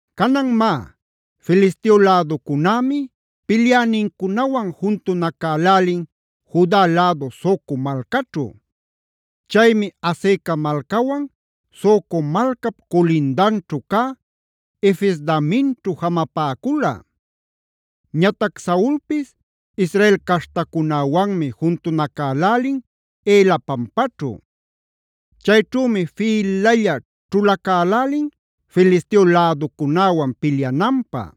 Canan má, Filisteo läducunämi pilyänincunawan juntunacälälin Juda lädu Soco malcaćhu. Chaymi Azeca malcawan Soco malcap culindanćhu cä Efes-damimćhu jamapäcula. Ñatac Saulpis Israel caśhtacunäwanmi juntunacälälin Ela pampaćhu. Chayćhümi fïlalla ćhulacälälin Filisteo läducunäwan pilyananpä.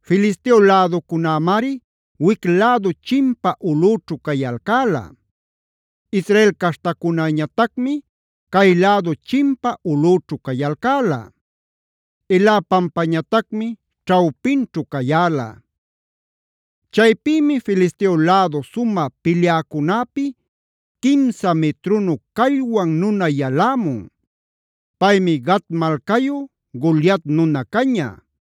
Filisteo läducunämari wic lädu chimpa ulꞌüćhu cayalcäla. Israel caśhtacunäñatacmi cay lädu chimpa ulꞌućhu cayalcäla. Ela pampañatacmi ćhawpinćhu cayäla. Chaypïmi Filisteo lädu sumä pilyäcunäpi quimsa mitrunu callwan nuna yalämun. Paymi Gat malcayu Goliat nuna caña.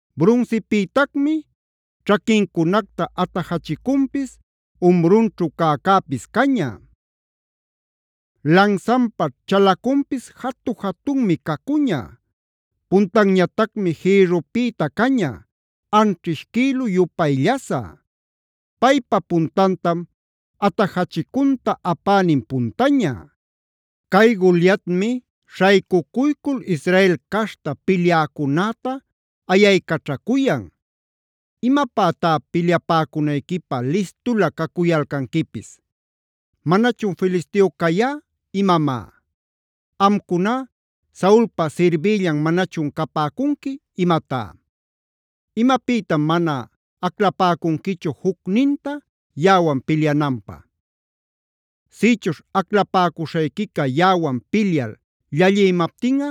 Brunsipïtacmi ćhaquincunacta atajachicunpis, umrunćhu cäcäpis caña. Lansanpa chalacunpis jatu-jatunmi cacuña; puntanñatacmi jïrrupïta caña, anćhish quïlu-yupay llasä. Paypa puntantam atajachicunta apänin puntaña. Cay Goliatmi śhaycucuycul Israel caśhta pilyäcunäta ayaycaćhacuyan: “¿Imapätá pilyapäcunayquipä listulä cacuyalcanquipis? ¿Manachun Filisteo cayá imamá? ¿Amcuná Saulpa sirbïllam manachun capäcunqui imatá? ¿Imapïtam mana aclapäcunquichu jucninta yaꞌawan pilyananpä? Sïchuśh aclapäcuśhayquica yaꞌawan pilyal llallïmaptinꞌa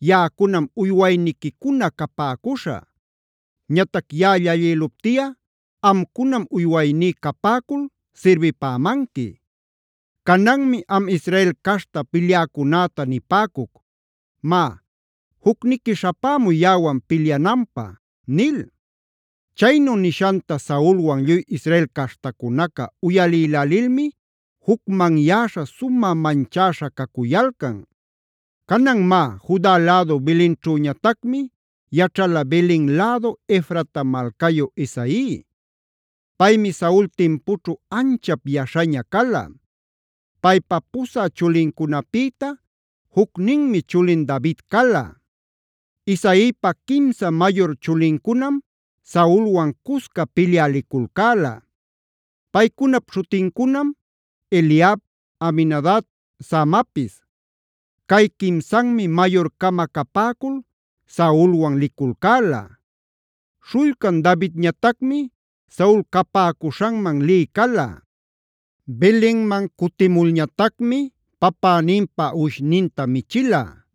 yaꞌacunam uywayniquicuna capäcuśhä. Ñatac yaꞌa llallïluptiꞌa amcunam uywayní capäcul sirbipämanqui. Cananmi am Israel caśhta pilyäcunäta nipäcuc: ‘Má, jucniqui śhapämuy yaꞌawan pilyananpä’” nil. Chaynu nishanta Saulwan lluy Israel caśhtacunaca uyalïlälilmi jucmanyäśha, sumä manchäśha cacuyalcan. Canan má, Juda lädu Belenćhüñatacmi yaćhala Belen lädu Efrata malcayu Isai. Paymi Saul timpućhu anchap yaśhaña cala. Paypa pusä chulincunapïta jucninmi chulin David cala. Isaipa quimsa mayur chulincunam Saulwan cusca pilyä liculcäla. Paycunap śhutincunam: Eliab, Abinadab, Samapis. Cay quimsanmi mayur-cama capäcul Saulwan liculcäla. Śhullcan Davidñatacmi Saul capäcuśhanman lï cala. Belenman cutimulñatacmi papäninpa uwishninta michila.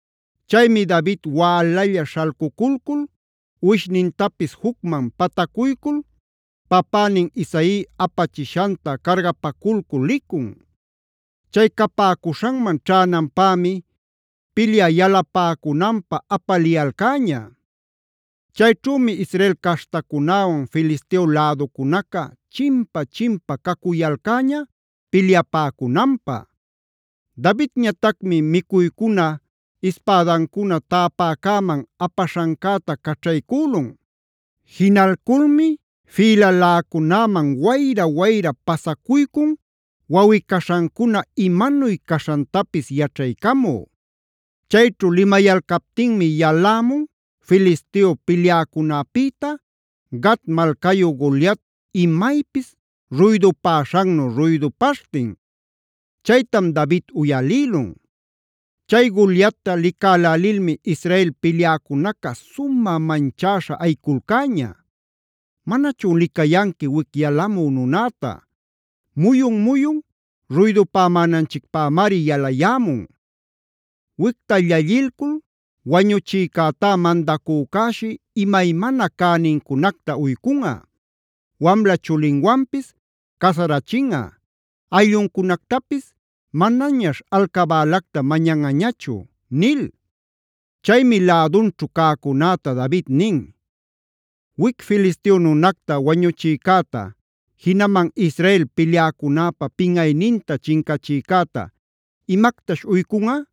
Chaymi David wälalla śhalcuculcul uwishnintapis jucman patacuycul papänin Isai apachishanta cargapaculcul licun. Chay capäcuśhanman ćhänanpämi pilyä yalapäcunanpä apaliyalcäña. Chayćhümi Israel caśhtacunäwan Filisteo läducunaca chimpa-chimpa cacuyalcäña pilyapäcunanpä. Davidñatacmi micuycuna, ispädancuna täpäcäman apaśhancäta caćhaycülun. Jinalculmi fïlaläcunäman wayra-wayra pasacuycun wawꞌi-caśhancuna imanuy caśhantapis yaćhaycamü. Chayćhu limayalcaptinmi yalämun Filisteo pilyäcunäpïta Gat malcayu Goliat imaypis ruydupäśhannu ruydupaśhtin. Chaytam David uyalïlun. Chay Goliatta licälälilmi Israel pilyäcunaca sumä manchäśha ayiculcäña: “¿Manachun licayanqui wic yalamü nunäta? Muyun-muyun ruydupamänanchicpämari yalayämun. Wicta llallilcul wañuchïcätá mandacücäshi imaymana cänincunacta uycunꞌa, wamla chulinwanpis casarachinꞌa; aylluncunactapis manañaśh alcabälacta mañanꞌañachu” nil. Chaymi lädunćhu cäcunäta David nin: “¿Wic Filisteo nunacta wañuchïcäta, jinaman Israel pilyäcunäpa pinꞌayninta chincachïcäta imactash uycunꞌa?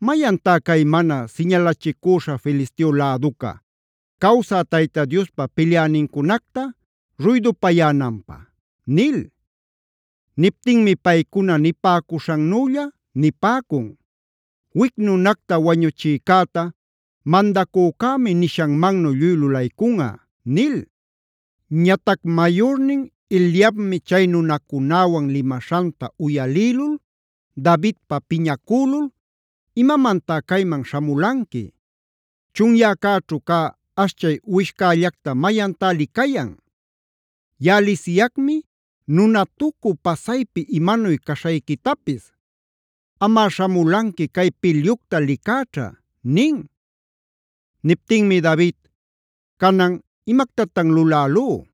¿Mayantá cay mana siñalachicüśha Filisteo läduca, cawsä Tayta Diospa pilyänincunacta ruydupayänanpä?” nil. Niptinmi paycuna nipäcuśhannülla nipäcun: “Wic nunacta wañuchïcäta mandacücämi nishanmannu lluy lulaycunꞌa” nil. Ñatac mayurnin Eliabmi chay nunacunäwan limaśhanta uyalïlul Davidpä piñacülul: “¿Imamantá cayman śhamulanqui? Chunyäcäćhu cä ashchay uwishcällacta, ¿mayantá licayan? Yaꞌa lisiyacmi nunatucü, pasaypi imanuy caśhayquitapis. Amꞌa śhamulanqui cay pilyucta licäćha” nin. Niptinmi David: “Canan, ¿imactatan lulälú?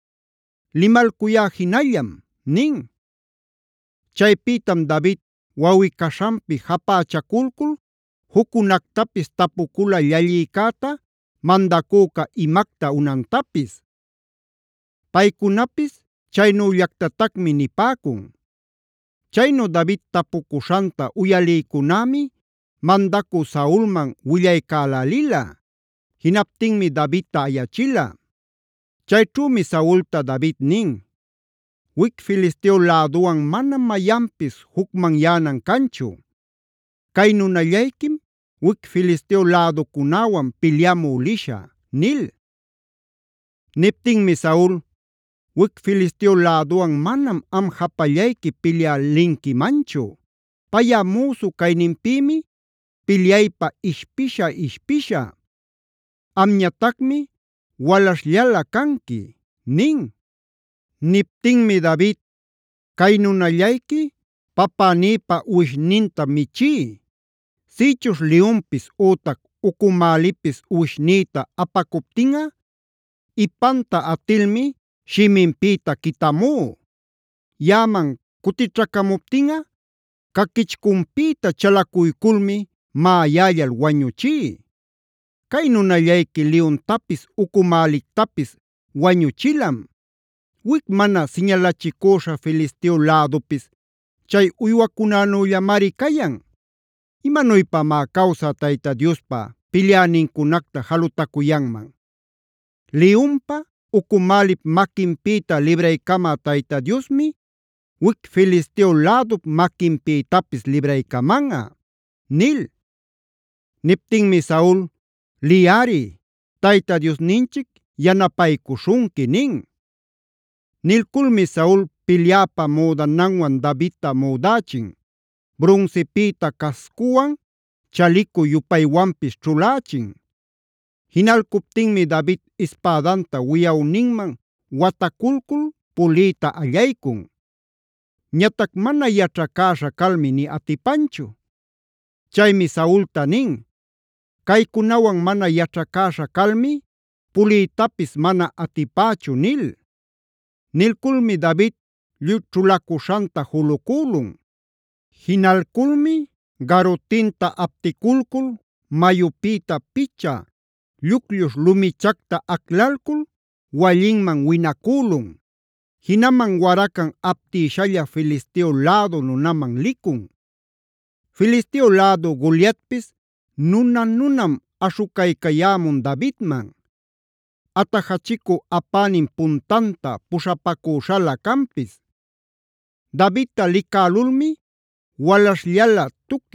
Limalcuyá jinallam” nin. Chaypïtam David wawꞌi-caśhanpi japächaculcul juccunactapis tapucula llallïcäta mandacüca imacta unantapis. Paycunapis chaynüllactatacmi nipäcun. Chaynu David tapucuśhanta uyalïcunämi mandacü Saulman willaycälälila. Jinaptinmi Davidta ayachila. Chayćhümi Saulta David nin: “Wic Filisteo läduwan manam mayanpis jucmanyänan canchu. Cay nunallayquim wic Filisteo läducunäwan pilyamü lishä” nil. Niptinmi Saul: “Wic Filisteo läduwan manam am japallayqui pilyä linquimanchu. Payꞌa müsu cayninpïmi pilyaypä ishpisha-ishpisha; amñatacmi walaśhllalä canqui” nin. Niptinmi David: “Cay nunallayqui papänïpa uwishnintam michí. Sïchuśh liyunpis ütac ucumälipis uwishnïta apacuptinꞌa, ipanta atilmi shiminpïta quitamú. Yaꞌaman cutićhacamuptinꞌa caquichcunpïta chalacuyculmi maꞌayällal wañüchí. Cay nunallayqui liyuntapis, ucumälictapis wañuchilam. Wic mana siñalachicüśha Filisteo lädupis chay uywacunänüllamari cayan. ¿Imanuypamá cawsä Tayta Diospa pilyänincunacta jalutacuyanman? Liyunpa, ucumälip maquinpïta libraycamä Tayta Diosmi wic Filisteo lädup maquinpïtapis libraycamanꞌa” nil. Niptinmi Saul: “Liyꞌari. Tayta Diosninchic yanapaycuśhunqui” nin. Nilculmi Saul pilyäpa müdananwan Davidta müdächin; brunsipïta cascuwan, chalicu-yupaywanpis ćhulächin. Jinalcuptinmi David ispädanta wiyawninman wataculcul puliyta allaycun. Ñatac mana yaćhacäśha calmi nï atipanchu. Chaymi Saulta nin: “Caycunawan mana yaćhacäśha calmi puliytapis mana atipächu” nil. Nilculmi David lluy ćhulacuśhanta julucülun. Jinalculmi garutinta apticulcul mayupïta picha lluclluśh lumichacta aclalcul wallinman winacülun. Jinaman waracan aptïshalla Filisteo lädu nunaman licun. Filisteo lädu Goliatpis nuna-nunam aśhucaycayämun Davidman; atajachicu apänin puntanta puśhapacüśhalä canpis. Davidta licälulmi walaśhllalä,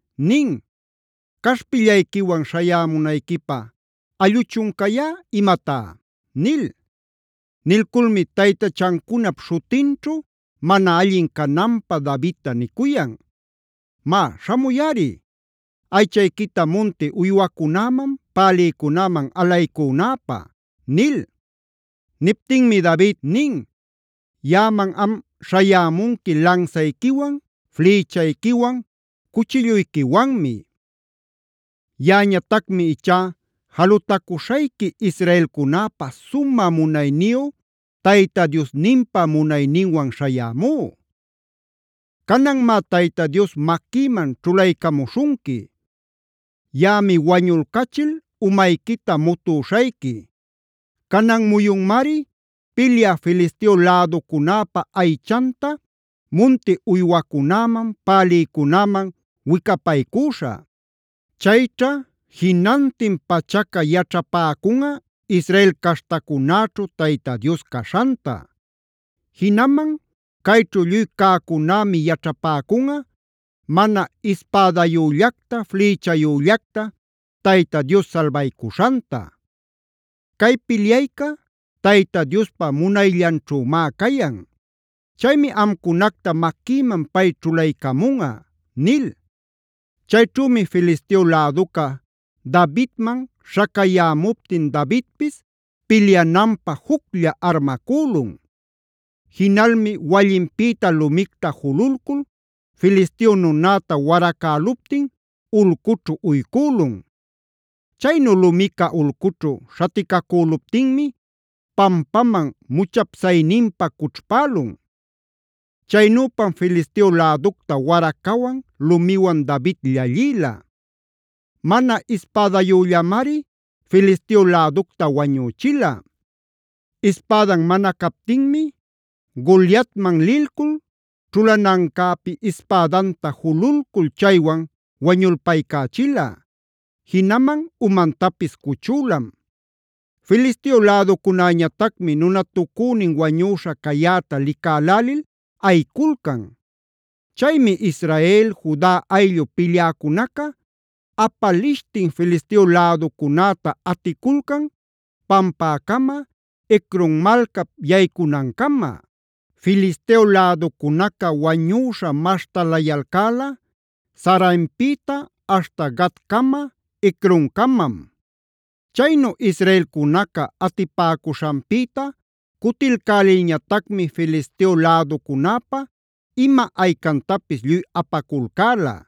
nin: “¿Caśhpillayquiwan śhayämunayquipä allꞌuchun cayá imatá?” nil. Nilculmi taytachancunap śhutinćhu mana allin cananpä Davidta nicuyan: “Má, śhamuyꞌari. Aychayquita munti uywacunäman, pälïcunäman alaycunäpä” nil. Niptinmi David nin: “Yaꞌaman am śhayämunqui lansayquiwan, flïchayquiwan, cuchilluyquiwanmi. Yaꞌañatacmi ichá jalutacuśhayqui israelcunäpä sumä munayniyu Tayta Diosninpa munayninwan śhayämú. Cananmá Tayta Dios maquïman ćhulaycamuśhunqui. Yaꞌami wañulcachil umayquita mutüśhayqui. Canan muyunmari pilyä Filisteo läducunäpa aychanta munti uywacunäman, pälïcunäman wicapaycüśhä. Chayćha jinantin pachaca yaćhapäcunꞌa Israel caśhtacunäćhu Tayta Dios caśhanta. Jinaman cayćhu lluy cäcunämi yaćhapäcunꞌa mana ispädayüllacta, flïchayüllacta Tayta Dios salbaycuśhanta. Cay pilyayca Tayta Diospa munayllanćhümá cayan. Chaymi amcunacta maquïman pay ćhulaycamunꞌa” nil. Chayćhümi Filisteo läduca Davidman śhacayämuptin Davidpis pilyananpä juclla armacülun. Jinalmi wallinpïta lumicta jululcul Filisteo nunäta waracäluptina ulcućhu uycülun. Chaynu lumica ulcućhu śhaticacüluptinmi pampaman muchapsayninpa cućhpälun. Chaynüpam Filisteo läducta waracawan, lumiwan David llallïla. Mana ispädayüllamari Filisteo läducta wañüchila. Ispädan mana captinmi, Goliatman lilcul ćhulanancäpi ispädanta jululcul chaywan wañulpaycächila. Jinaman umantapis cuchülam. Filisteo läducunäñatacmi nunatucünin wañüśha cayäta licalälil ayiculcan. Chaymi Israel, Juda ayllu pilyäcunaca apalishtin Filisteo läducunäta aticulcan pampäcama, Ecron malcap yaycunancama. Filisteo läducunaca wañüśha maśhtalayalcäla Saaraimpïta aśhta Gatcama, Ecroncamam. Chaynu israelcunaca atipäcuśhanpïta cutilcälilñatacmi Filisteo läducunäpa ima aycantapis lluy apaculcäla.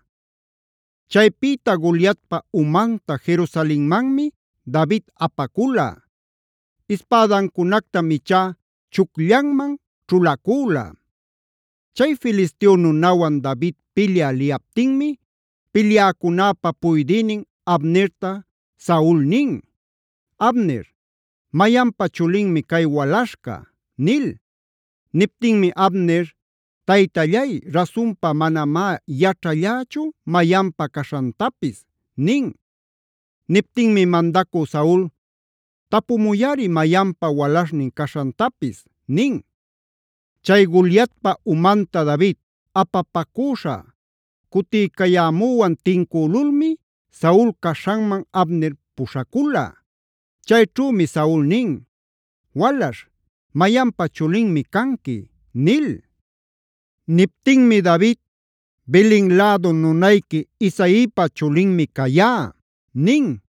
Chaypïta Goliatpa umanta Jerusalenmanmi David apacula. Ispädancunactam ichá chucllanman ćhulacüla. Chay Filisteo nunawan David pilyä liyaptinmi pilyäcunäpa puydïnin Abnerta Saul nin: “Abner, ¿mayanpa chulinmi cay walaśhca?” nil. Niptinmi Abner: “Taytallay, rasunpa manamá yaćhallächu mayanpa caśhantapis” nin. Niptinmi mandacü Saul: “Tapumuyꞌari mayanpa walaśhnin caśhantapis” nin. Chay Goliatpa umanta David apapacüśha cutiycayämüwan tincülulmi Saul caśhanman Abner puśhacula. Chayćhümi Saul nin: “Walaśh, ¿mayanpa chulinmi canqui?” nil. Niptinmi David: “Belen lädu nunayqui Isaipa chulinmi cayá” nin.